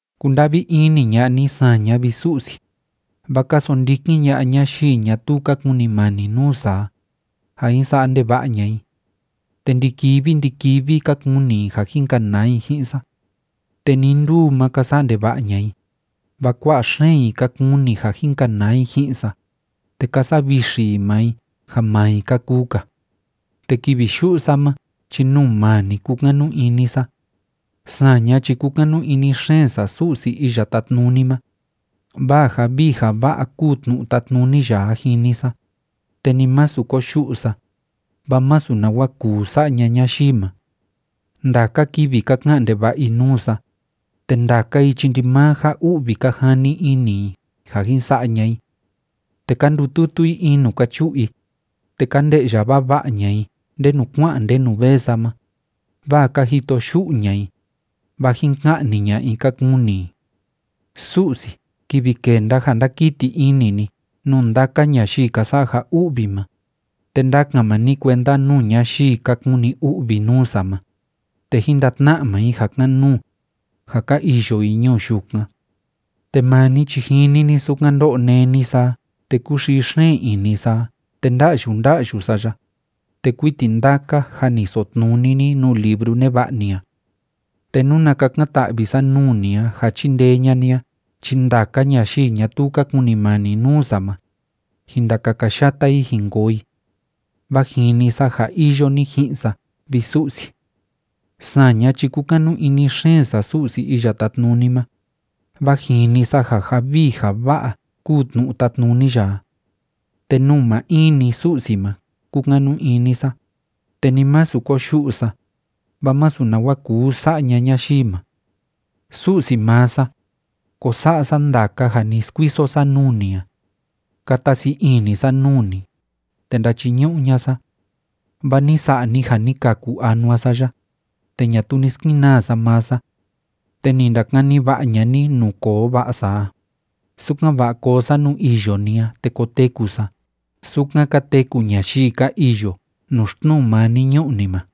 Kunda'vi ini ña'a ni saña, vi Su'si, vaa ka sondikin ña'a ñayii ñatuu ka kunimani nuu sa a, ja jin sa'a ndeva'a ña'a i. Te ndi‑kivi ndi‑kivi ka kuni i ja jin kanaa i ji'in sa. Te nii nduu ma ka sa'a ndeva'a ña'a i, vaa kua'a xeen i ka kuni ja jin kanaa i ji'in sa, te ka savixi i maa i ja maa i ka kuu‑ka. Te kivi yu'u sa ma chi nuu maa ni kúkanu ini sa. Saña chi kúkanu ini xeen sa Su'si Iya Tátnuni ma, vaa ja vii ja va'a kúu tnu'u tátnuni ya a jini sa, te ni masu koyu'u sa, vaa masu nawa kuu sa'a ña'a ñayii ma. Ndaka kivi ka ka'an ndeva'a i nuu sa, te ndaka i chi ndimaa ja u'vi ka jani ini i ja jin sa'a ña'a i. Te ka ndututu i in nuu ka chu'u i, te ka nde'ya vava'a ña'a i ndenu kua'an ndenu vee sa ma, vaa ka jito yu'u ña'a i, vaa jin ka'ni ña'a i ka kuni i. Su'si, kivi kenda ja ndakiti ini ni nuu ndaka ñayii ka sa'a ja u'vi ma, te ndakan maa ni kuenda nuu ñayii ka kuni u'vi nuu sa ma, te jín ndatna'a maa i ja kan‑nuu, ja ka iyo i ñuu yukan. Te maa ni chi jini ni sukan ndó'o néni sa a te kúxii xeen ini sa a te nda'yu nda'yu sa ya, te kuiti ndaka jâ ni sotnuni ni nuu libru neva'a ni a. Te nuna kakan‑ta'vi sa nuu ni a ja chindee ña'a ni a chi ndaka ñayii ñatuu ka kunimani nuu sa ma, jin ndakakayata i jin koo i. Vaa jini sa ja iyo ni ji'in sa, vi Su'si. Saña chi kúkanu ini xeen sa Su'si Iya Tátnuni ma, vaa jini sa ja ja vii ja va'a kúu tnu'u tátnuni ya a. Te nuu maa in‑ni Su'si ma kúkanu ini sa, te ni masu koyu'u sa, vaa masu nawa kuu sa'a ña'a ñayii ma. Su'si maa sa, ko sa'a sa ndaka ja ni skuiso sa nuu ni a. Kata sii ini sa nuu ni, te ndachiñu'u ña'a sa. Vaa ni sa'a ni ja ni kaku anua sa ya, te ñatuu ni skenaa sa maa sa. Te ni ndakani va'a ña'a ni nuu koo va'a sa a, sukan‑va'a koo sa nuu iyo ni a te koteku sa sukan ka teku ñayii ka iyo nuu xtnuu maa ni ñu'u ni ma.